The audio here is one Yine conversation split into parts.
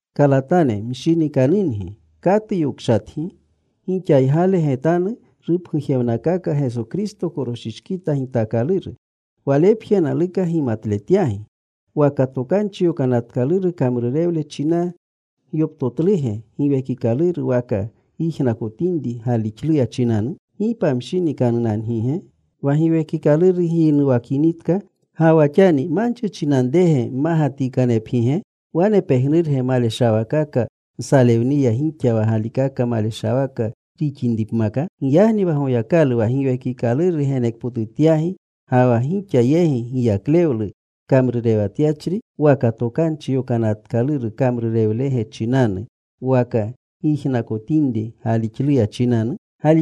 Kalatane mshinikanungi, ¿katu yokshatgi? Gixaygale getanu rupgujewnakaaka Geso Kristo koroshishkita gitaakaluru. Walepje naluka gimatletyagi: ¿Waka Tokanchi Yokanatkaluru kamrurewle chinanu gyoptotluge Giwekikaluru, waka gyijnakotinri galixluya chinanu? ¿Gi pamshinikanunangige? Wa Giwekikaluru gyinuwakinitka, ga wa xani ¿manchi chinanrege mmagatikanepgige? ¿Wane pejnurge maleshawaakaka nsalewniya gixa wa galikaka maleshawaka rixinipmaka? Giyagni wa Goyakalu wa Giwekikaluru genekpotutyagi ga wa gixa yegi giyaklewlu kamrurewatyachri ¿waka Tokanchi Yokanatkaluru kamrurewlege chinanu waka gyijnakotinri galixluya chinanu?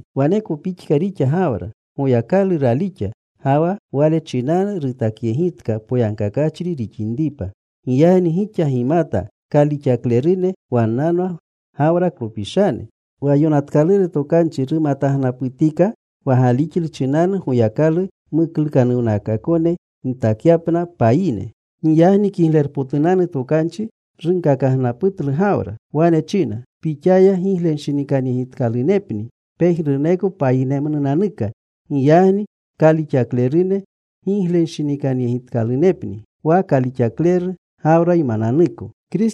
Waneko pixka rixa Gawra. Goyakalu ralixa, ga wa wale chinanu rutakyegitka poyagkakachri rixinripa. Giyagni gixa gimata kalixaklerune wannanwa Gawraklopishane. Wa yonatkaluru tokanchi rumatagnaputika wa galixlu chinanu Goyakalu muklukanuwnakaakone gitakyapna payine. Giyagni Kiglerpotunanu Tokanchi runkakagnaputlu Gawra. Wane china, “Pixaya giglenshinikanyegitkalunepni pejnuruneko payinemnunanuka.” Giyagni kalixaklerune giglenshinikanutkalunepni wa kalixakleru Gawraymananuko.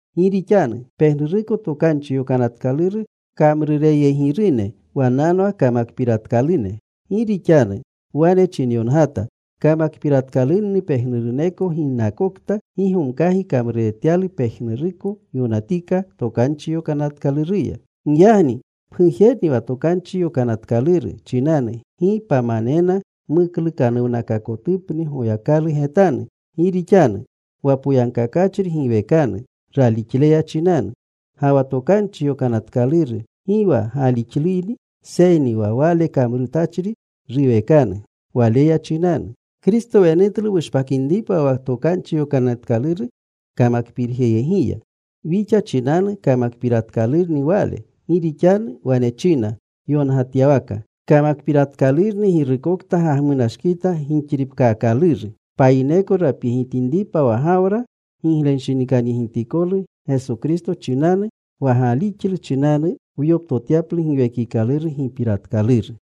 Gi rixanu pejnuruneko Tokanchi Yokanatkaluru kamrureyegirune, wannanwa kamakpiratkalune. Gi rixanu wane chinyongata, “Kamakpiratkalunni pejnuruneko ginnakokta gi gomkagi kamruretyalu pejnuruko yonatika Tokanchi Yokanatkaluruya.” Giyagni pgujerni wa Tokanchi Yokanatkaluru chinanu gi pamanena muklukanuwnakaakotupni Goyakalu getanu. Gi rixanu: Wa poyagkakachri giwekanu ralixleya chinanu. Ga wa Tokanchi Yokanatkaluru gi wa galixluyni, seyni wa wale kamrutachri ruwekanu waleya chinanu. Kristo wenutlu wushpakinripa wa Tokanchi Yokanatkaluru kamakpiiryegiya. Wixa chinanu kamakpiratkalurni Wale. Gi rixanu wane china yongatyawaka, “Kamakpiratkalurni girukokta gagmunashkita gixripkaakaluru.” Payineko rapyegitinripa wa Gawra giglenshinikanyegitikolu Geso Kristo chinanu, wa galixlu chinanu wyoptotyaplu Giwekikaluru gipiratkaluru.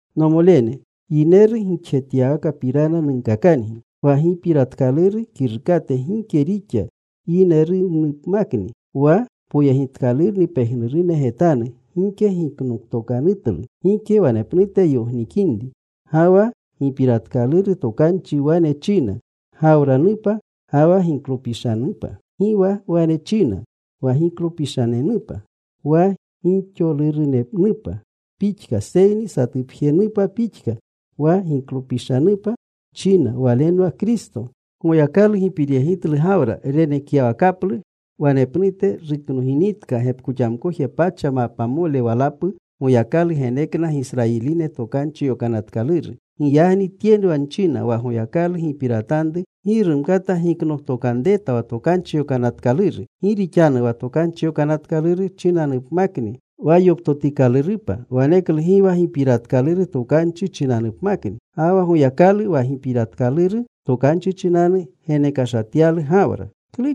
Nomolene, yineru gixjetyawakapirana nunkakangi: Wa gipiratkaluru kirukate gike rixa yinerunupmakni, wa poyegitkalurni pejnurune getanu, gike giknoktokanutlu. Gike wanepnute yognikinri. Ga wa gipiratkaluru tokanchi wane china, “Gawranupa ga wa giklopishanupa.” Gi wa wane china, “Wa giklopishanenupa,” wa gixolurunenupa pixka, seyni satupjenupa pixka, “Wa giklopishanupa,” china. Walenwa Kristo. Goyakalu gipiryegitlu Gawra renekyawakaplu. Wanepnute, ruknoginitka gepkoxamkoje pacha mapmole walapu, Goyakalu genekna Gisrayiline Tokanchi Yokanatkaluru. Giyagni tyenwa nchina, wa Goyakalu gipiratanru gi rumkata giknoktokanreta wa Tokanchi Yokanatkaluru. Gi rixanu wa Tokanchi Yokanatkaluru chinanupmakni wa yoptotikalurupa, waneklu gi wa gipiratkaluru tokanchi chinanupmakni. Ga wa Goyakalu wa gipiratkaluru tokanchi chinanu genekashatyalu Gawra.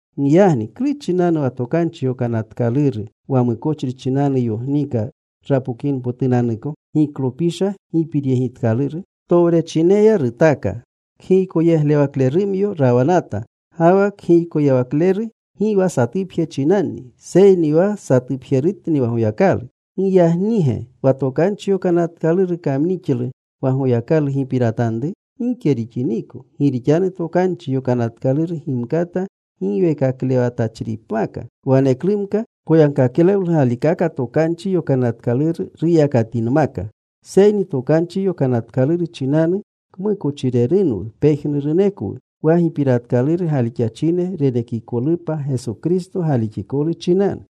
Giyagni ¿klu chinanu wa Tokanchi Yokanatkaluru? Wa mukochri chinanu yogniika rapokinpotunanuko giklopisha gipiryegitkaluru. Towrechineya rutaaka. Kgiykoyeglewaklerumyo rawanata. Ga wa kgiykoyeglewakleru gi wa satupje chinanni. Seyni wa satupjerutni wa Goyakalu. ¿Giyagnige wa Tokanchi Yokanatkaluru kamnixlu wa Goyakalu gipiratanru? Gike rixiniko. Gi rixanu Tokanchi Yokanatkaluru gimkata giweekaklewatachripmaka, waneklumka poyagkaklewlu galikaka Tokanchi Yokanatkaluru ruyakatinmaka. Seyni Tokanchi Yonatkaluru chinanu kmukochrirerunwu pejnurunekwu, wa gipiratkaluru galixachine renekikolupa Geso Kristo galixikolu chinanu.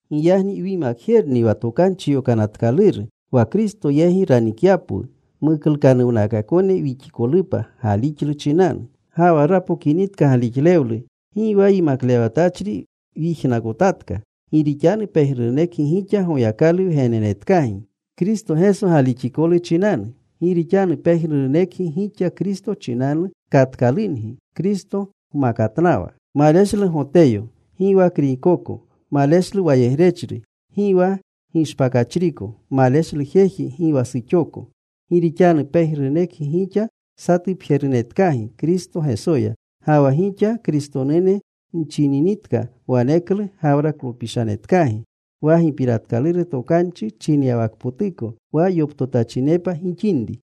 Giyagni wyimakjerni wa Tokanchi Yokanatkaluru, wa Kristo yegi ranikyapwu, muklukanuwnakaakone wixikolupa galixlu chinanu. Ga wa rapokinitka galixlewlu, gi wa yimaklewatachri wyijnakotatka. Gi rixanu pejnurunekgi gixa Goyakalu wgenenetkagi Kristo Geso galixikolu chinanu. Gi rixanu pejnurunekgi gixa Kristo chinanu katkalungi, Kristo gmakatnawa. Maleshlu Goteyo, gi wa Kriykoko. Maleshlu wayegrechri, gi wa gishpakachriko. Maleshlu jeji, gi wa suxoko. Gi rixanu pejnurunekgi gixa satupjerunetkagi Kristo Gesoya. Ga wa gixa Kristonune nchininitka, waneklu Gawraklopishanetkagi, wa gipiratkaluru tokanchi chinyawakpotuko wa yoptotachinepa gixinri.